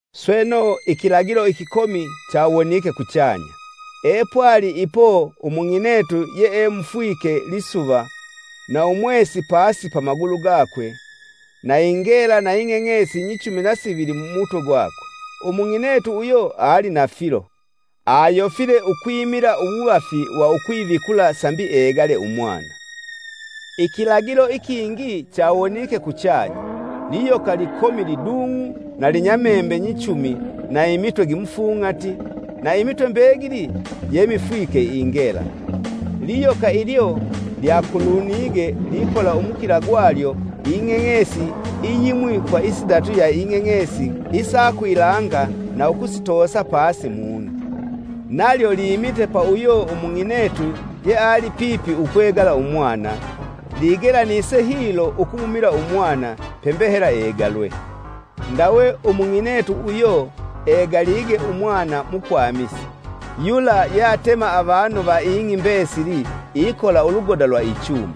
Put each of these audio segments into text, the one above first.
Sweno, ikilagilo ikikomi chawonike kuchanya. Epwali ipo umung'inetu yeemufwike lisuva, na umwesi pasi pa magulu gakwe, na ingela na ing'eng'esi nyichumi na sivili mumutwe gwakwe! Umung'inetu uyo ali na filo, ayofile ukwimila uwuvafi wa ukwivikula sambi egale umwana. Ikilagilo ikingi chawonike kuchanya: liyoka likomi lidung'u na linya membe nyichumi na imitwe gimufung'ati, na imitwe mbegili jemifwike ingela. Liyoka ilyo lyakulumite likola umukila gwalyo ing'eng'esi iyimwi kwa isidatu ya ing'eng'esi isa kwilanga na ukusitoosa pasi mung'i. Nalyo limite pa uyo Umung'inetu yeali pipi ukwegala umwana, ligelanise hilo ukumumila umwana, pembe hela egalwe. Ndawe umung'inetu uyo egalige umwana mukwamisi, yula yeatema avanu va ing'i mbesili ikola ulugoda lwa ichuma.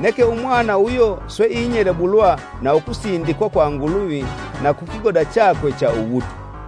Neke umwana uyo swe inyelebulwa na ukusindikwa kwa Nguluvi na ku kigoda chakwe cha uwutwa.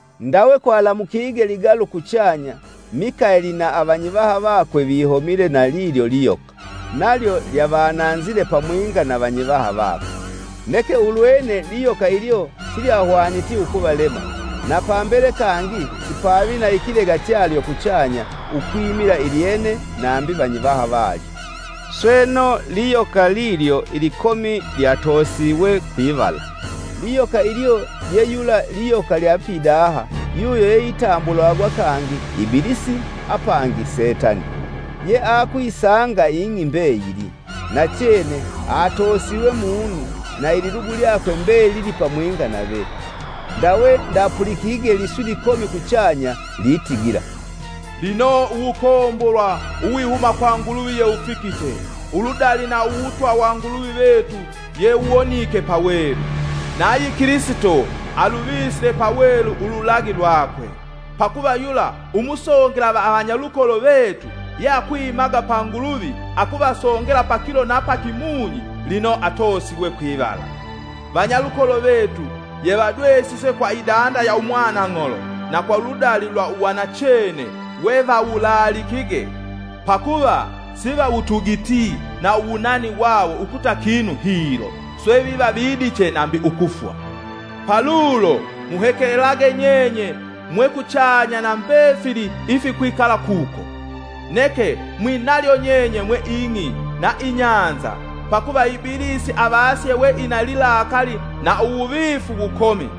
Ndawe kwalamukige ligalu kuchanya: Mikaeli na avanyivaha vakwe vihomile na lilyo liyoka, nalyo lyavananzile pamwinga na vanyivaha vakwe. Neke ulwene liyoka ilyo silyahwaniti ukuvalema, na pambele kangi sipavi na ikilega chalyo kuchanya ukwimila ilyene nambi vanyivaha valyo. Sweno, liyoka lilyo ilikomi lyatosiwe kwivala. Liyoka ilyo ye yula liyoka lya pidaha yuyo yeitambulwagwa kangi, Ibilisi apangi Setani. Ye akuyisanga ing'i mbeyili. Nachene, atoosiwe mung'i, na ililugu lyakwe mbelili pamwinga nave. Ndawe ndapulikige liswi likomi kuchanya litigila, “Lino uwukombolwa uwihuma kwa Nguluvi yewufikite! Uludali na Uwutwa wa Nguluvi vetu yewuwonike pawelu. Nayi Kilisito aluvisile pawelu ululagi lwakwe! Pakuva yula umusongela va avanyalukolo vetu, yeakwimaga pa Nguluvi akuvasongela pakilo na pakimunyi, lino atoosiwe kwivala. Vanyalukolo vetu yevadwesise kwa idanda ya umwanang'olo na kwa uludali lwa uwanachene wevawulaalikige, pakuva sivawutugiti na uwunani wawo ukuta kinu hilo, swe viva vidiche nambi ukufwa. Palulo, muhekelelage nyenye mwe kuchanya na mbefili ifikwikala kuko. Neke, mwinalyo nyenye mwe ing'i na ibahali, pakuva Ibilisi avasye we ina lilakali na uwuvifu wukomi,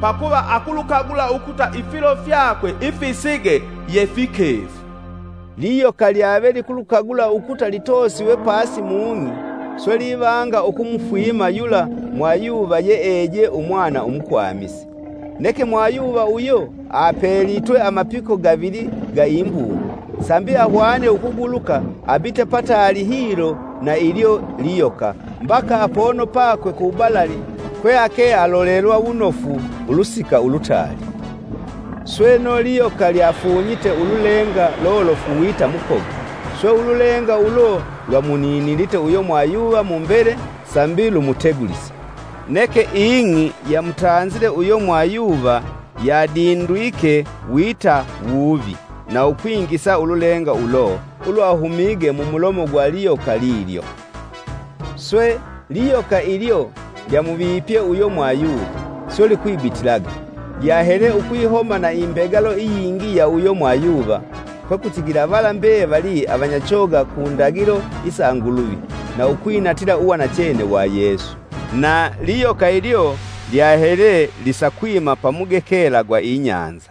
pakuva akulukagula ukuta ifilo fyakwe ifisige ye fikefu.” Liyoka lyave likulukagula ukuta litoosiwe pasi mung'i, swe livanga ukumufwima yula mwayuva yee eje umwana umukwamisi. Neke mwayuva uyo apelitwe amapiko gavili ga imbungu sambi ahwane ukuguluka abite pataali hilo na ilyo liyoka, mbaka apono pakwe ku balali kwe ake alolelwa wunofu ulusika ulutaali. Sweno, liyoka lyafunyite ululenga lolofu wita mukoga, swe ululenga ulo lwamuninilite uyo mwayuva mumbele sambi lumutegulise. Neke ing'i yamutanzile uyo mwayuva yadindwike wita wuvi na ukwingisa ululenga ulo ulwahumige mumulomo gwa liyoka lilyo. Swe, liyoka ilyo lyamuvipye uyo mwayuva, swe likwibitilaga, lyahele ukwihoma na imbegalo iyingi ya uyo mwayuva, kwekutigila vala mbevali avanyachoga ku ndagilo isa Nguluvi na ukwinatila uwanachene wa Yesu. Na liyoka ilyo lyahele lisakwima pamugekela gwa ibahali.